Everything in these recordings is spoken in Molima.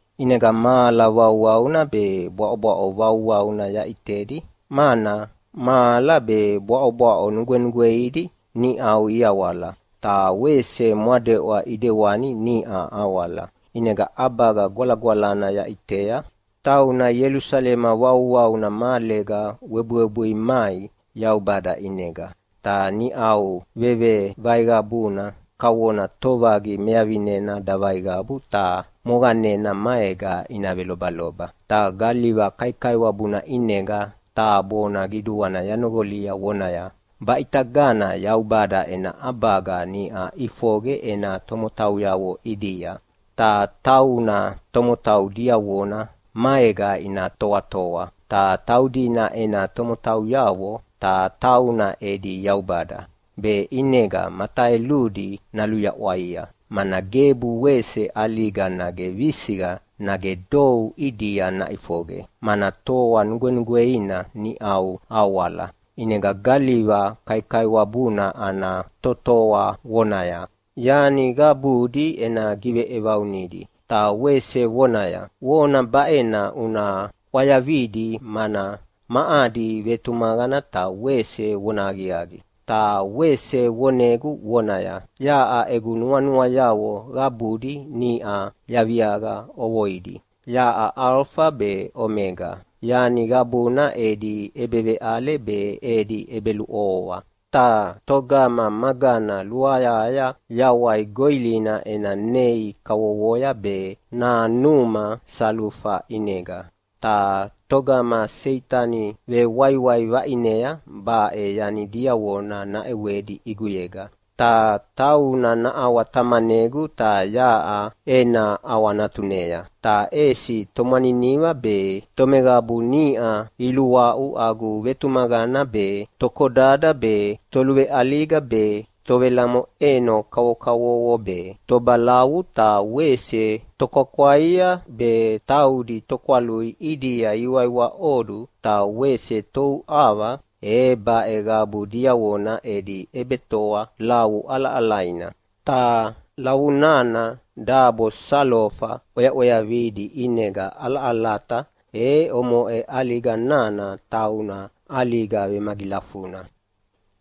ʼInega mahala vauvauna be bwaʼobwaʼo vauvauna yaʼitedi mana mahala be bwaʼobwaʼo nugwenugweidi niʼau iawala, ta wese mwadeʼwa ʼidewani niʼa awala. ʼInega ʼabaga gwalagwalana yaʼitea, tauna Ielusalema vauvauna mahalega webuwebui mai Yaubada ʼinega. Ta niʼau vevevaiqavuna kavona tovaqi mevavinena davaiqavu ta moqanena maega ina velobaloba. Ta galiva kaikaiwabuna ʼinega taha bona qiduana yanoqolia vonaya, “Baʼitagana Yaubada ena ʼabaga niʼa ʼifoqe ena tomotauyavo ʼidia. Ta tauna tomotau diavona maega ina toatoa, ta taudina ena tomotauyavo, ta tauna edi Yaubada. Be ʼinega mataeludi naluyaʼwaia, mana gebu wese ʼaliga nage visiqa nage dou ʼidia naʼifoqe, mana toa nugwenugweina niʼau awala.” ʼInega galiva kaikaiwabuna ana totoa vonaya, “Yani qabudi ena giveʼevaunidi!” Ta wese vonaya, “Vona baʼena una ʼwayavidi, mana ma adi vetumaqana ta wese vonahaqiaqi.” Ta wese vonegu vonaya, “Yaʼa egu nuanuayavo qabudi niʼa yaviaqa ʼovoidi. Yaʼa Alofa be Omega, yani qabuna edi ʼebeveʼale be edi ʼebeluʼovoa. Ta togama magana luayahaya yawai goʼilina ena nei kavovoya be nanuma salufa ʼinega. Ta togama Seitani vewaiwai vaʼinea baʼe yani diavona naʼewedi ʼiguyega, ta tauna naʼawatamanegu ta yaʼa ena ʼawanatunea. Ta ʼesi tomwaniniva be, tomeqabu niʼa iluaʼu agu vetumaqana be, tokodada be, toluveʼaliga be, tovelamoʼeno kavokavovo be, tobalavu ta wese tokwakwaia be, taudi tokwalui ʼidia ihiwaiwaʼodu ta wese touʼava, e baʼe qabu diavona edi ʼebetoa lavu ʼalaʼalaina, ta lavu nana dabo salofa ʼweaʼweavidi ʼinega ʼalaʼalata. E omoʼe ʼaliga nana tauna ʼaliga vemagilafuna.”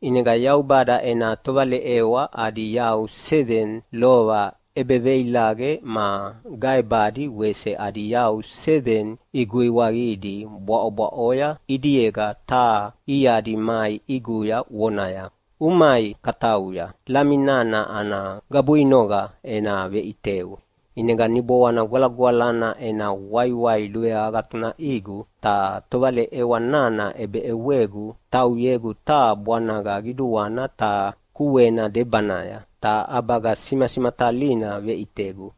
ʼInega Yaubada ena tovaleʼewa adi yau seveni lova ʼebeveilaqe ma gaebadi wese adi yau seveni iguiwaqidi bwaʼobwaʼoya ʼidiega taha iadi mai ʼiguya vonaya, “Umai katauya, Lami nana ana gabuinoqa ena veʼiteu.” ʼInega Niboana Gwalagwalana ena waiwai luveagatunaʼigu ta tovaleʼewa nana ʼebeʼewegu tauyegu taha bwanaga qiduana ta kuena debanaya, ta ʼabaga simasimatalina veʼitegu,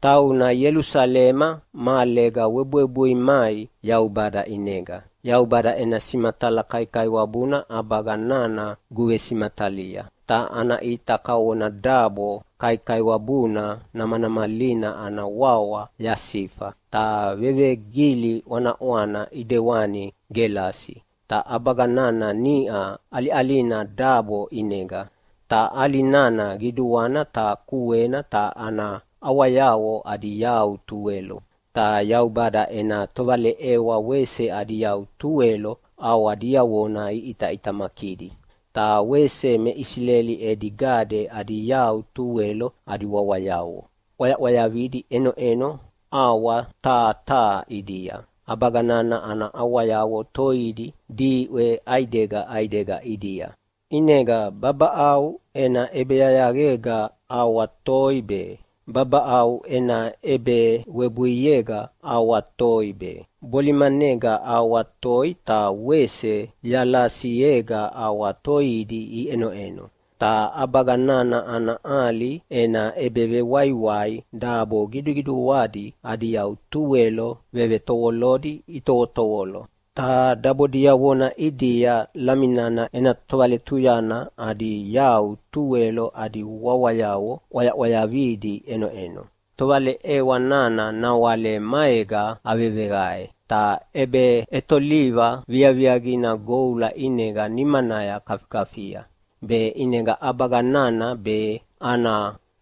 tauna Ielusalema mahalega webuwebui mai Yaubada ʼinega. Yaubada ena simatala kaikaiwabuna ʼabaga nana guvesimatalia, ta ana ʼita kavona dabo kaikaiwabuna namanamalina ana wawa yasifa, ta vevegili ʼwanaʼwana ʼedewani gelasi. Ta ʼabaga nana niʼa ʼaliʼalina dabo ʼinega, ta ʼali nana qiduana ta kuena ta ana ʼawayavo adi yau tuwelo, ta Yaubada ena tovaleʼewa wese adi yau tuwelo ʼawa diavona iʼitaʼitamakidi. Ta wese me Isileli edi gade adi yau tuwelo adi wawayavo ʼwayaʼwayavidi ʼenoʼeno ʼawa taha taha ʼidia. ʼAbaga nana ana ʼawayavo toidi diʼwe ʼaidega ʼaidega ʼidia. ʼInega babaʼau ena ʼebeyayaqega ʼawa toi be, babaʼau ena ʼebewebuiega ʼawa toi be, bolimanega ʼawa toi ta wese yalasiega ʼawa toidi iʼenoʼeno. Ta ʼabaga nana ana ʼali ena ʼebevewaiwai dabo qiduqiduadi adi yau tuwelo vevetovolodi itovotovolo, ta dabo diavona ʼidia Lami nana ena tovaletuyana adi yau tuwelo adi wawayavo ʼwayaʼwayavidi ʼenoʼeno. Tovaleʼewa nana nawale maega aveveqae, ta ʼebeʼetoliva viaviaqina goula ʼinega nimanaya kafikafia, be ʼinega ʼabaga nana be, ana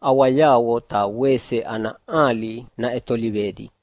ʼawayavo ta wese ana ʼali naʼetolivedi.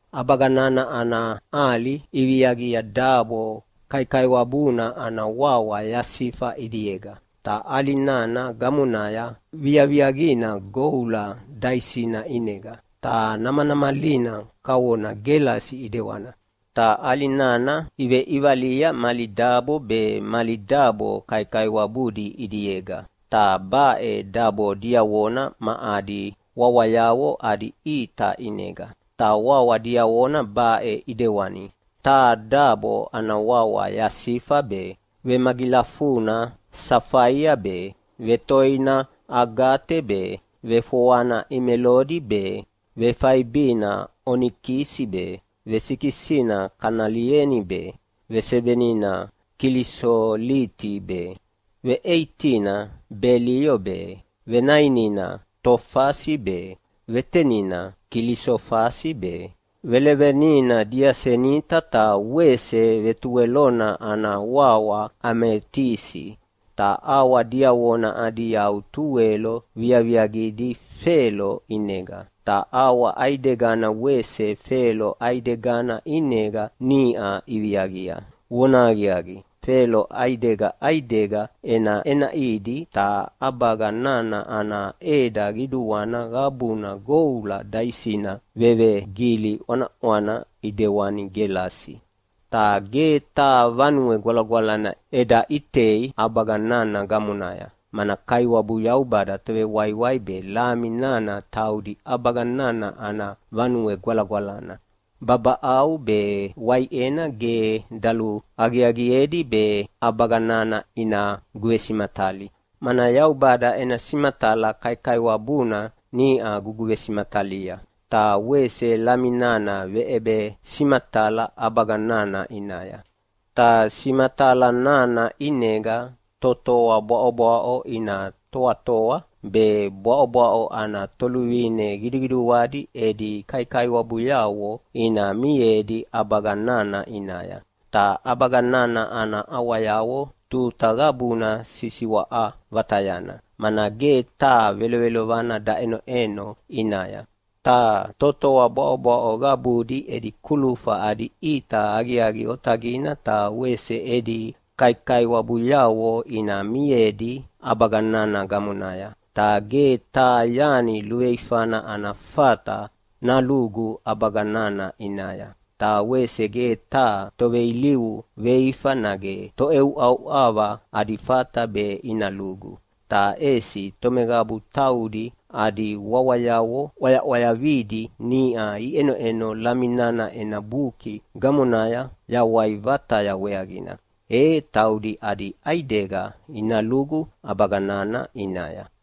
ʼAbaga nana ana ʼali iviaqia dabo kaikaiwabuna ana wawa yasifa ʼidiega, ta ʼali nana gamonaya viaviaqina goula daisina ʼinega, ta namanamalina kavona gelasi ʼidewana. Ta ʼali nana iveʼivalia mali dabo be mali dabo kaikaiwabudi ʼidiega. Ta baʼe dabo diavona ma adi wawayavo adi ʼita ʼinega, ta wawa diavona baʼe ʼidewani: Taha dabo ana wawa yasifa be, vemagilafuna safaia be, vetoina agate be, vefoana emelodi be, vefaibina onikisi be, vesikisina kanelieni be, vesevenina kilisoliti be, veʼeitina belio be, venainina tofasi be, vetenina kilisofasi be, velevenina diasenita ta wese vetuwelona ana wawa ametisi. Ta ʼawa diavona adi yau tuwelo viaviaqidi felo ʼinega. Ta ʼawa ʼaidegana wese felo ʼaidegana ʼinega niʼa iviaqia. Vonahaqiaqi, felo ʼaidega ʼaidega ʼenaʼenaʼidi. Ta ʼabaga nana ana ʼeda qiduana qabuna goula daisina vevegili ʼwanaʼwana ʼedewani gelasi. Ta ge taha Vanue Gwalagwalana eda ʼitei ʼabaga nana gamonaya, mana Kaiwabu Yaubada Tovewaiwai be Lami nana taudi ʼabaga nana ana Vanue Gwalagwalana. Babaʼau be waiʼena ge daluaqiaqiedi be ʼabaga nana ina guvesimatali, mana Yaubada ena simatala kaikaiwabuna niʼa guguvesimatalia, ta wese Lami nana veʼebesimatala ʼabaga nana ʼinaya. Ta simatala nana ʼinega totoa bwaʼobwaʼo ina toatoa, be bwaʼobwaʼo ana toluvine qiduqiduadi edi kaikaiwabuyavo ina miedi ʼabaga nana ʼinaya. Ta ʼabaga nana ana ʼawayavo tuta qabuna sisiwaʼa vatayana, mana ge taha velovelovana daʼenoʼeno ʼinaya. Ta totoa bwaʼobwaʼo qabudi edi kulufa adi ʼita aqiaqi otaqina ta wese edi kaikaiwabuyavo ina miedi ʼabaga nana gamonaya. Ta ge taha yani luveifana ana fata nalugu ʼabaga nana ʼinaya. Ta wese ge taha toveilivu veifa nage toʼeuʼauʼava adi fata be ina lugu. Ta ʼesi tomeqabu taudi adi wawayavo ʼwayaʼwayavidi niʼa ʼenoʼeno Lami nana ena Buki gamonaya Yawai vataya weaqina, e taudi adi ʼaidega ina lugu ʼabaga nana ʼinaya.